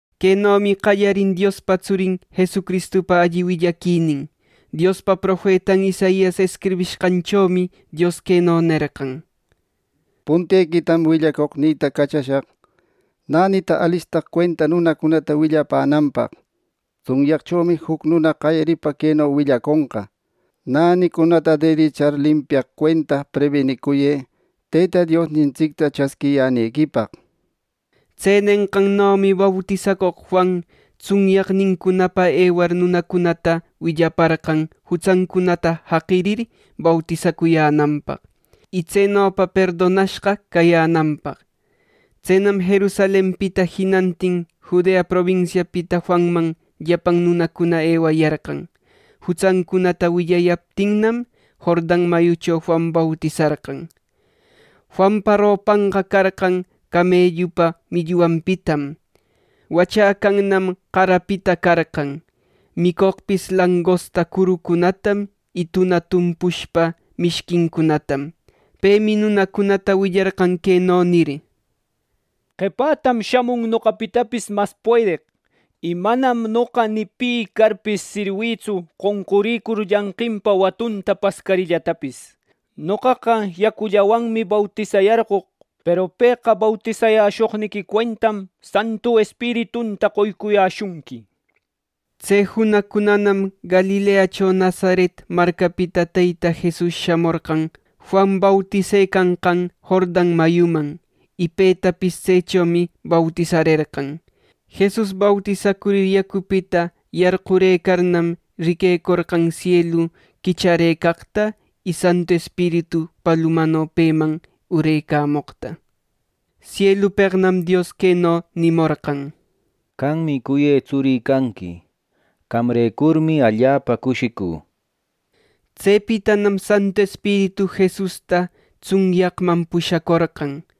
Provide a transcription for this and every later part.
Quenomi qallarin Diospa tsurin Jesucristupa alli willaquinin: Diospa profetan Isaias escribishqanchomi ˻Dios˼ queno nerqan: “Puntequitam willacoqnïta cachashaq, nänita alistaq cuenta nunacunata willapänanpaq. Tsunyaqchomi juc nuna qayaripa queno willaconqa: ‘Nänicunata derechar limpiaq cuenta prebinicuyë Teyta Diosnintsicta chasquiyänequipaq’” nir. Tse nenqannomi bautisacoq Juan tsunyaqnincunapa ewar nunacunata willaparqan jutsancunata jaqirir, bautisacuyänanpaq, y tsenopa perdonashqa cayänanpaq. Tsenam Jerusalenpita jinantin Judea probinsiapita Juanman llapan nunacuna ewayarqan. Jutsancunata willayaptinnam Jordan mayucho Juan bautisarqan. Juanpa ropanqa carqan camellupa millwanpitam. Wachäcannam qarapita carqan. Micoqpis langosta curucunatam y tuna tumpushpa mishquincunatam. Pemi nunacunata willarqan queno nir: —Qepätam shamun noqapitapis mas puedeq, y manam noqa ni pi carpis sirwïtsu qonqurïcur llanqinpa watunta pascarillatapis. Noqaqa yacullawanmi bautisayarcoq, peru pëqa bautisayäshoqniqui cuentam Santu Espiritunta qoycuyäshunqui. Tse junaqcunanam Galileacho Nazaret marcapita Teyta Jesus shamorqan Juan bautisecanqan Jordan mayuman, y petapis tsechomi bautisarerqan. Jesus bautisacurir, yacupita yarqurëcarnam, riquecorqan sielu quicharëcaqta y Santu Espiritu palumano peman urecamoqta. Sielupeqnam Dios queno nimorqan: —Qammi cuyë tsurï canqui. Qamrecurmi allapa cushicü. Tsepitanam Santu Espiritu Jesusta tsunyaqman pushacorqan.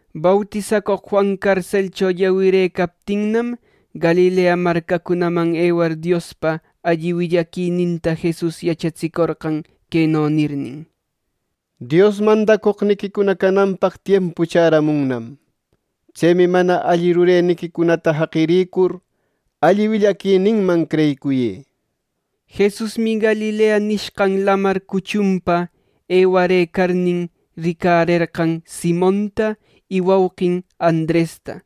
Bautisacoq Juan carselcho llawirëcaptinnam, Galilea marcacunaman ewar Diospa alli willaquininta Jesus yachatsicorqan queno nirnin: —Dios mandacoqniquicuna cananpaq tiempu chäramunnam. Tsemi mana alli rureniquicunata jaqirïcur, alli willaquininman creyicuyë. Jesusmi Galilea nishqan Lamar cuchunpa ewarëcarnin, ricarerqan Simonta y wauqin Andresta.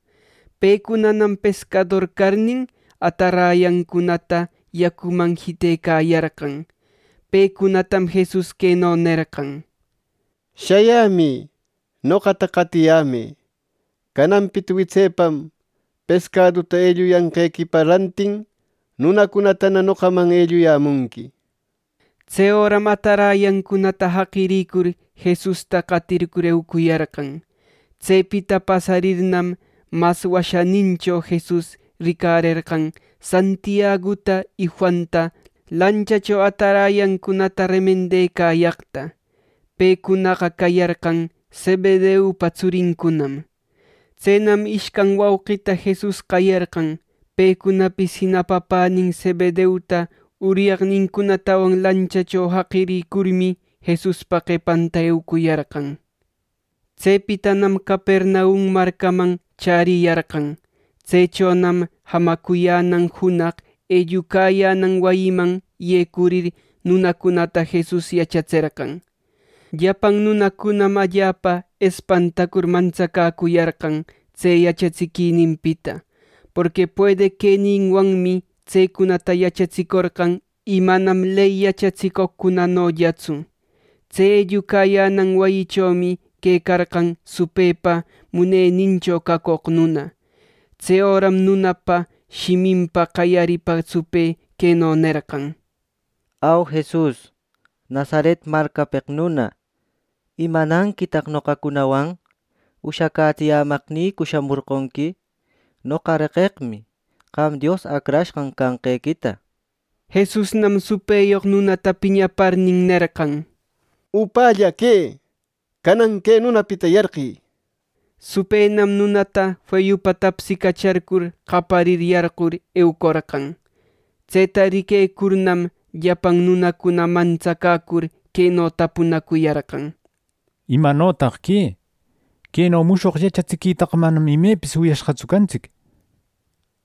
Pecunam pescador carnin, atarayancunata yacuman jitecayarqan. Pecunatam Jesus queno nerqan: —Shayämï. Noqata qatiyämë. Cananpita witsepam pescaduta elluyanqequipa rantin nunacunatana noqaman elluyämunqui. Tse öram atarayancunata jaqiricur, Jesusta qatircur eucuyarqan. Tsepita pasarirnam, mas washänincho Jesus ricarerqan Santiaguta y Juanta lanchacho atarayancunata remendecayaqta. Pecunaqa cayarqan Zebedeupa tsurincunam. Tsenam ishcan wauqita Jesus qayarqan. Pecunapis jina papänin Zebedeuta uryaqnincunatawan lanchacho jaqirïcurmi, Jesuspa qepanta eucuyarqan. Tsepitanam Capernaum marcaman chäriyarqan. Tsechonam jamacuyänan junaq ellucayänan wayiman yecurir nunacunata Jesus yachatserqan. Llapan nunacuna allapa espantacur mantsacäcuyarqan tse yachatsiquininpita, porqui puedeq queninwanmi tsecunata yachatsicorqan y manam ley yachatsicoqcunanollatsu. Tse ellucayänan wayichomi quecarqan supëpa munenincho cacoq nuna. Tse öram nunapa shiminpa qayaripa supë queno nerqan: —Au, Jesus Nazaret marcapeq nuna ¿Imananquitaq noqacunawan? ¿Ushacätsiyämaqnïcu shamorqonqui? ¡Noqa reqeqmi, qam Dios Acrashqan canqequita! Jesusnam supëyoq nunata piñaparnin, nerqan: —¡Upälla que! ¡Canan que nunapita yarqï! —nir. Supënam nunata feyupa tapsicacharcur, qaparir yarqur eucorqan. Tseta riquecurnam, llapan nunacuna mantsacäcur queno tapunacuyarqan: —¿Imanotaq que? Queno mushoq yachatsiquitaqa manam imepis wiyashqatsu cantsic.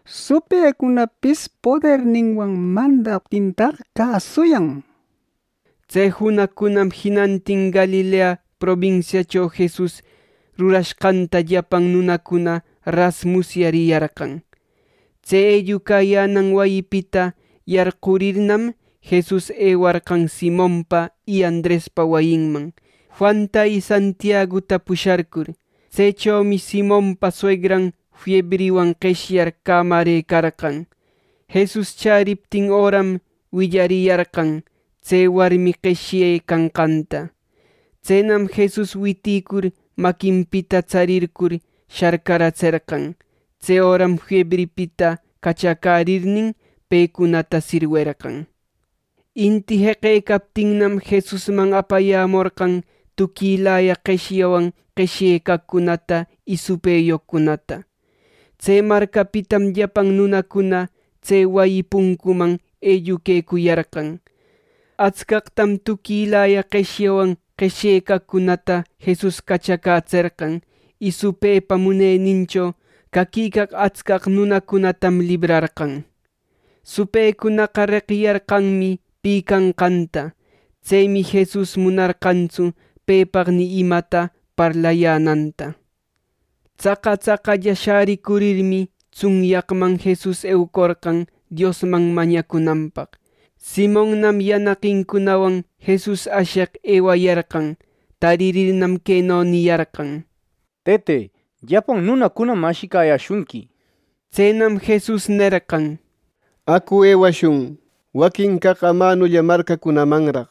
¡Supëcunapis poderninwan mandaptintaq cäsuyan! —nir. Tse junaqcunam jinantin Galilea probinsiacho Jesus rurashqanta llapan nunacuna ras musyariyarqan. Tse ellucayänan wayipita yarqurirnam, Jesus ewarqan Simonpa y Andrespa wayinman, Juanta y Santiaguta pusharcur Tsechomi Simonpa suegran fiebriwan qeshyar cämarëcarqan. Jesus chäriptin öram willariyarqan tse warmi qeshyecanqanta. Tsenam Jesus witïcur maquinpita tsarircur sharcaratserqan. Tse öram fiebripita cachacärirnin, pecunata sirwerqan. Inti jeqecaptinnam, Jesusman apayämorqan tuquilaya qeshyawan qeshyaqcunata y supëyoqcunata. Tse marcapitam llapan nunacuna tse wayi puncuman elluquecuyarqan. Atscaqtam tuquilaya qeshyawan qeshyaqcunata Jesus cachacätserqan, y supëpa munenincho caquicaq atscaq nunacunatam librarqan. Supëcunaqa reqiyarqanmi pi canqanta. Tsemi Jesus munarqantsu pepaq ni imata parlayänanta. Tsaqa tsaqalla shäricurirmi, tsunyaqman Jesus eucorqan Diosman mañacunanpaq. Simonnam yanaqincunawan Jesus asheq ewayarqan. Taririrnam, queno niyarqan: —Tëte, llapan nunacunam ashicayäshunqui. Tsenam Jesus nerqan: —Acu ewashun waquin caq amanulla marcacunamanraq.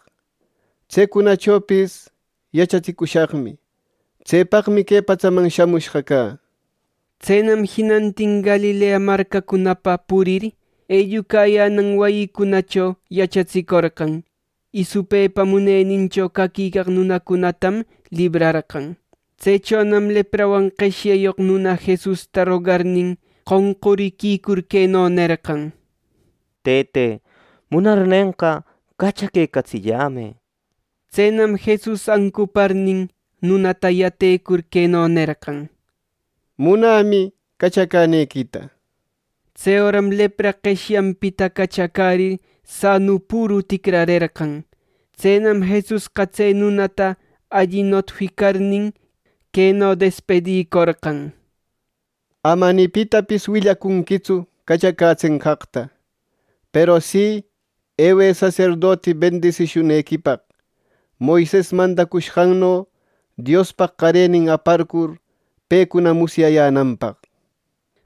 Tsecunachopis yachatsicushaqmi. Tsepaqmi que patsaman shamushqa cä. Tsenam jinantin Galilea marcacunapa purir, ellucayänan wayicunacho yachatsicorqan, y supëpa munenincho caquicaq nunacunatam librarqan. Tsechonam leprawan qeshyayoq nuna Jesusta rogarnin, qonquriquicur queno nerqan: —Tëte, munarnenqa, cachaquecatsillämë —nir. Tsenam Jesus ancuparnin, nunata yatecur queno nerqan: —Munämi, cachacänequita. Tse öram lepra qeshyapita cachacärir, sanu püru ticrarerqan. Tsenam Jesusqa tse nunata alli notificarnin, queno despidicorqan: —Ama ni pitapis willacunquitsu cachacätsenqaqta. Peru si, ewë saserdoti bendisishunequipaq, Moises mandacushqanno Diospaq qarenin aparcur pecuna musyayänanpaq.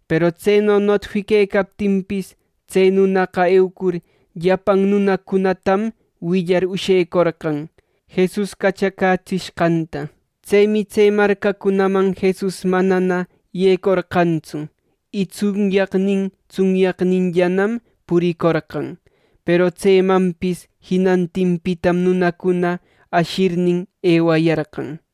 Peru tseno notifiquecaptinpis, tse nunaqa eucur llapan nunacunatam willar ushecorqan Jesus cachacätsishqanta. Tsemi tse marcacunaman Jesus manana yecorqantsu, y tsunyaqnin tsunyaqninllanam puricorqan. Peru tsemanpis jinantinpitam nunacuna ashirnin, ewayarqan.